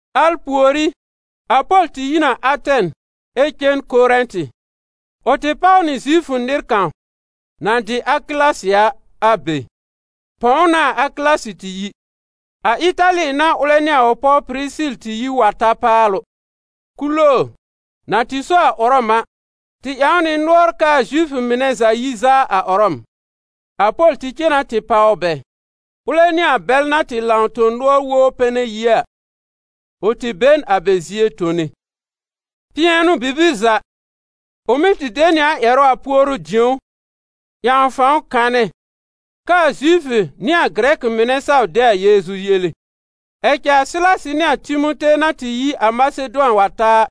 Al pùorí, a Pol tɩ yi n a Atɛn ɛ cen Korɛ̃tɩ. Ʋ tɩ páw nɩ Zifʋ nɩr kãw, na dɩ Akɩlasɩ a, a be. Pɔ̃w n'a a Akɩlasɩ tɩ yi. A Ɩtali n'a ʋlɛ nɩ a ʋ pɔw Pɩrɩsɩl tɩ yi wa ta paalʋ. Kuloor, na tɩ so a Ʋrɔm a, tɩ ƴãw nɩ nʋɔr kɛ a Zifʋ mɩnɛ za yi zaa a Ʋrɔm. A Pol tɩ cen na tɩ páw bɛ. Ʋlɛ nɩ a bɛl na tɩ lãw tõ-nʋɔr wobr pɛnɛ yie a, ʋ tɩ be n a bɛ zie tone. Pɩɛnʋ-bibir za, ʋ mɩ́ tɩ de nɩ a ƴɛrʋ a puoru-dĩ̀ó, ƴãw fãw kanɛ kɛ a Zifʋ nɩ a Gɩrɛkɩ mɩnɛ saw de a Yeezu yele. Ɛ cɛ a Sɩlasɩ nɩ a Timote na tɩ yi a Masedʋan wa ta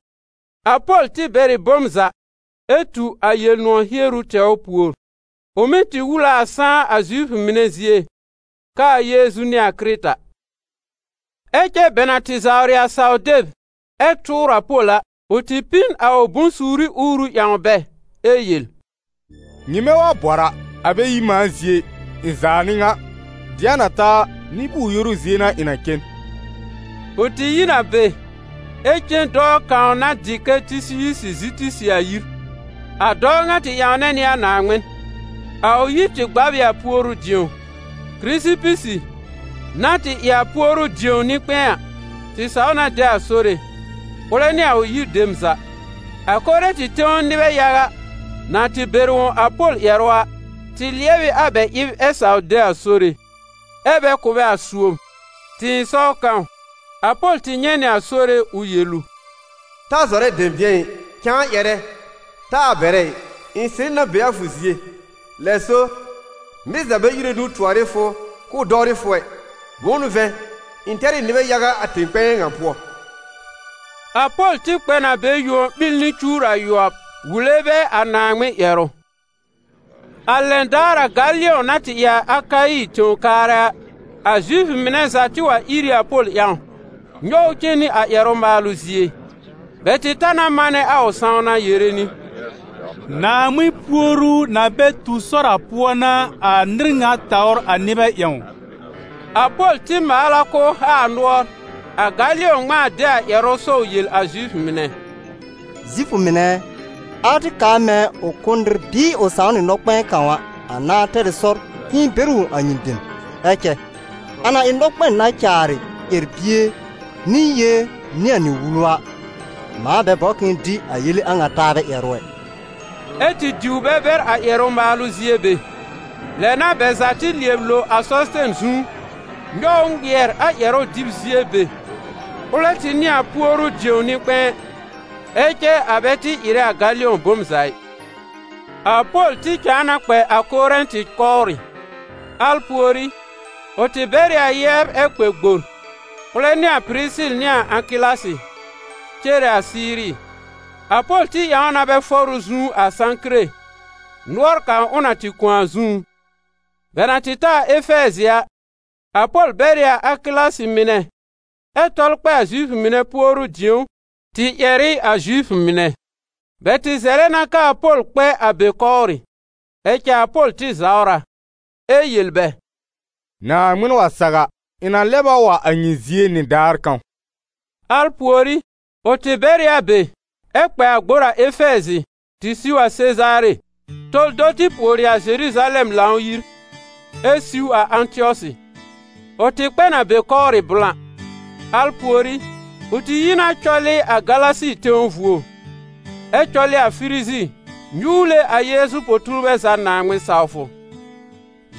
a, a Pol tɩ bɛr ɩ bom za, ɛ tu a Yel-nʋ̃ɔ̀ hieru tɛwr pùor. Ʋ mɩ́ tɩ wul a a sãá a Zifʋ mɩnɛ zie, kɛ a Yeezu n'ɩ a Kɩrɩta. Ɛ cɛ bɛ na tɩ zawrɩ a saw-deb ɛ tʋʋr a Pol a, ʋ tɩ pĩ n a ʋ bʋ̃-suuri uuru ƴãw bɛ ɛ yel: «Nyɩmɛ wa bɔr a, a bɛ yi mãa zie ɩ! Ɩ̃ zaa n'ɩ ŋa! Dɩ̃a na ta a, nɩ-bʋʋr-yoru zie n'a ɩ̃ na cen.» Ʋ tɩ yi n a be ɛ cen dɔɔ kãw na dɩ kɛ Tɩsiyusɩ Zitisɩ a yir. A dɔɔ ŋa tɩ ƴãwnɛ nɩ a Naaŋmɩn. A ʋ yir tɩ gbab ɩ a puoru-dĩo. Kɩrɩsɩpɩsɩ, na tɩ ɩ a puoru-dĩo nɩ-kpɛ̃ɛ a, tɩ saw na de a Sore, ʋlɛ nɩ a ʋ yir dem za. A Korɛ̃tɩ tẽw nɩbɛ yaga, na tɩ bɛr wõ a Pol ƴɛrʋ a, tɩ lɩɛbɩ a bɛ ɩb ɛ saw de a Sore, ɛ́ bɛ kʋ̀ bɛ a suob. Tɩ̃ɩsɔw kãw, a Pol tɩ nyɛ̃ nɩ a Sore ʋ yel ʋ: «Ta zɔrɛ dɛ̃bɩ̃ɛ ɩ, cãa ƴɛrɛ, taa bɛrɛ ɩ. Ɩ̃ sɩrɩ na be a fʋ zie. Lɛ so, nɩr za bɛ íre nũu tʋɔr ɩ fʋ k'ʋʋ dɔwrɩ fʋ ɛ. Bʋ̃ʋ n'ʋ vɛ̃, ɩ̃ tɛr ɩ nɩbɛ yaga a tẽ-kpɛ̃ɛ ŋa pʋɔ.» A Pol tɩ kpɛ n a be yuon ɓil nɩ cuwr ayʋɔb, wule bɛ a Naaŋmɩn ƴɛrʋ. A lɛn daar a Galɩɔ̃ na tɩ ɩ a Akayi tẽw kaarɛ a, a Zifʋ mɩnɛ za tɩ wa ìr ɩ a Pol ƴãw, nyɔw ʋ cen nɩ ƴɛrʋ-maalʋ zie. Bɛ tɩ ta na manɛ a ʋ sãwna yere nɩ: «Naaŋmɩn puoru na bɛ tu sɔr a pʋɔ n'a a nɩr ŋa tawr a nɩbɛ ƴãwn.» A Pol tɩ maal a k'ʋʋ haa a nʋɔr, a Galɩɔ̃ ŋmãa de a ƴɛrʋ sɔw yel a Zifʋ mɩnɛ: «Zifʋ mɩnɛ ɛ, alɛ tɩ kaar mɛ̃ ʋ kʋ́ n nɩr bɩɩ ʋ sãw nɩ nɔ-kpɛ̃ɛ kãw a, a nãá tɛr ɩ sɔr k'ɩ̃ɩ bɛr wõ a nyɩ dem. Ɛ cɛ a na ɩ nɔkpɛn na caarɩ ƴɛr-bie, nɩ yée, nɩ a nyɩ wulu a, mãa bɛ bɔbr k'ɩ̃ɩ dɩ a yele a ŋa taabɛ ƴɛrʋ ɛ.» Ɛ tɩ diw bɛ bɛr a ƴɛrʋ-maalʋ zie be. Lɛ n'a bɛ za tɩ lɩɛb lo a Sɔsɩtɛn zu, nyɔw ʋ ŋmɩɛr a ƴɛrʋ-dɩb zie be. Ʋlɛ tɩ n'ɩ a puoru-dĩo nɩ-kpɛ̃ɛ. Ɛ cɛ a bɛ tɩ ɩrɛ a Galɩɔ̃ bom za ɩ. A Pol tɩ cãa na kpɛ a Korɛ̃tɩ kɔwrɩ. Al pùorí, ʋ tɩ bɛr ɩ a yɛbr ɛ kpɛ gbor, ʋlɛ nɩ a Pɩrɩsɩl nɩ a Akɩlasɩ, cere a Siiri. A Pol tɩ ƴãw na bɛ fɔr ʋ zu a Sãkire, nʋɔr kãw ʋ na tɩ kõ a zũú. Bɛ na tɩ ta a Efɛɛzɩ a, a Pol bɛr ɩ a Akɩlasɩ mɩnɛ ɛ tɔl kpɛ a Zifʋ mɩnɛ puoru-dĩ̀ó tɩ ƴɛr ɩ a Zifʋ mɩnɛ. Bɛ tɩ zɛlɛ na kɛ a Pol kpɛ a be kɔwrɩ. Ɛ cɛ a Pol tɩ zawr a, ɛ yel bɛ: «Naaŋmɩn wa saw a, ɩ̃ na lɛb a wa a nyɩ zie nɩdaar kãw.» Al pùorí, ʋ tɩ bɛr ɩ a be ɛ kpɛ a gbor a Efɛɛzɩ tɩ siw a Sezaare, tɔl do tɩ pùori a Zeruzalɛm Lãw-yir, ɛ siw a Ãtɩɔsɩ. Ʋ tɩ kpɛ n a be kɔwrɩ blã. Al pùorí, ʋ tɩ yi na cɔlɩ a Galasi tẽw vuo, ɛ cɔlɩ a Firizi, nyuwle a Yeezu po-tuurbɛ za Naaŋmɩn-sawfʋ.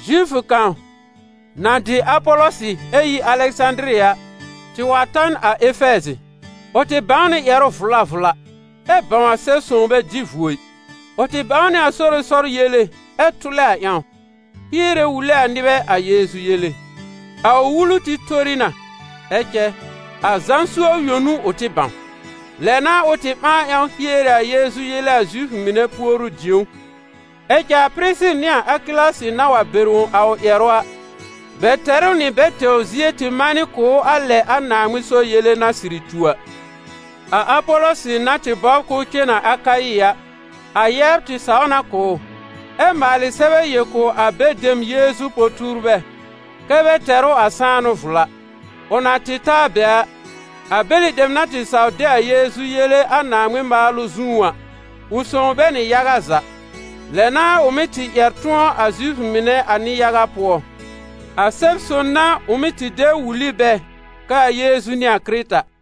Zifʋ kãw, na dɩ Apɔlɔsɩ ɛ yi Alɛsãdiri a, tɩ wa ta n a Efɛɛzɩ. Ʋ tɩ bãw nɩ ƴɛrʋ vla vla, ɛ bãw a Sɛb-sõw bɛ dɩ vuo ɩ. Ʋ tɩ bãw nɩ a Sore sɔr yele ɛ tʋlɛ a ƴãw, hiere wule a nɩbɛ a Yeezu yele. A ʋ wulu tɩ tori na, ɛ cɛ, a Zã suob yõ n'ʋ ʋ tɩ bãw. Lɛ n'a ʋ tɩ ɓãa ƴãw hiere a Yeezu yele a Zifʋ mɩnɛ puoru-dĩ̀ó. Ɛ cɛ a Pɩrɩsɩl nɩ a Akɩlasɩ na wa bɛr wõ a ʋ ƴɛrʋ a, bɛ tɛr ʋ nɩ bɛ tɛwr zie tɩ manɩ kʋ̀ ʋ a lɛ a Naaŋmɩn sɔr yele na sɩrɩ tu a. A Apɔlɔsɩ na tɩ bɔbr k'ʋʋ cen a Akayi a, a yɛbr tɩ saw na kʋ̀ ʋ, ɛ maalɩ sɛbɛ yel kʋ̀ a be dem Yeezu po-tuurbɛ kɛ́ bɛ tɛr ʋ a sãanʋ vla. Ʋ na tɩ ta a be a, a bɛlɩ dem na tɩ saw de a Yeezu yele a Naaŋmɩn maalʋ zũú a, ʋ sõw bɛ nɩ yaga za. Lɛ n'a ʋ mɩ́ tɩ ƴɛr tʋ̃ɔ a Zifʋ mɩnɛ a nɩ-yaga pʋɔ. A Sɛb-sõn n'a ʋ mɩ́ tɩ de wul ɩ bɛ kɛ a Yeezu n'ɩ a Kɩrɩta.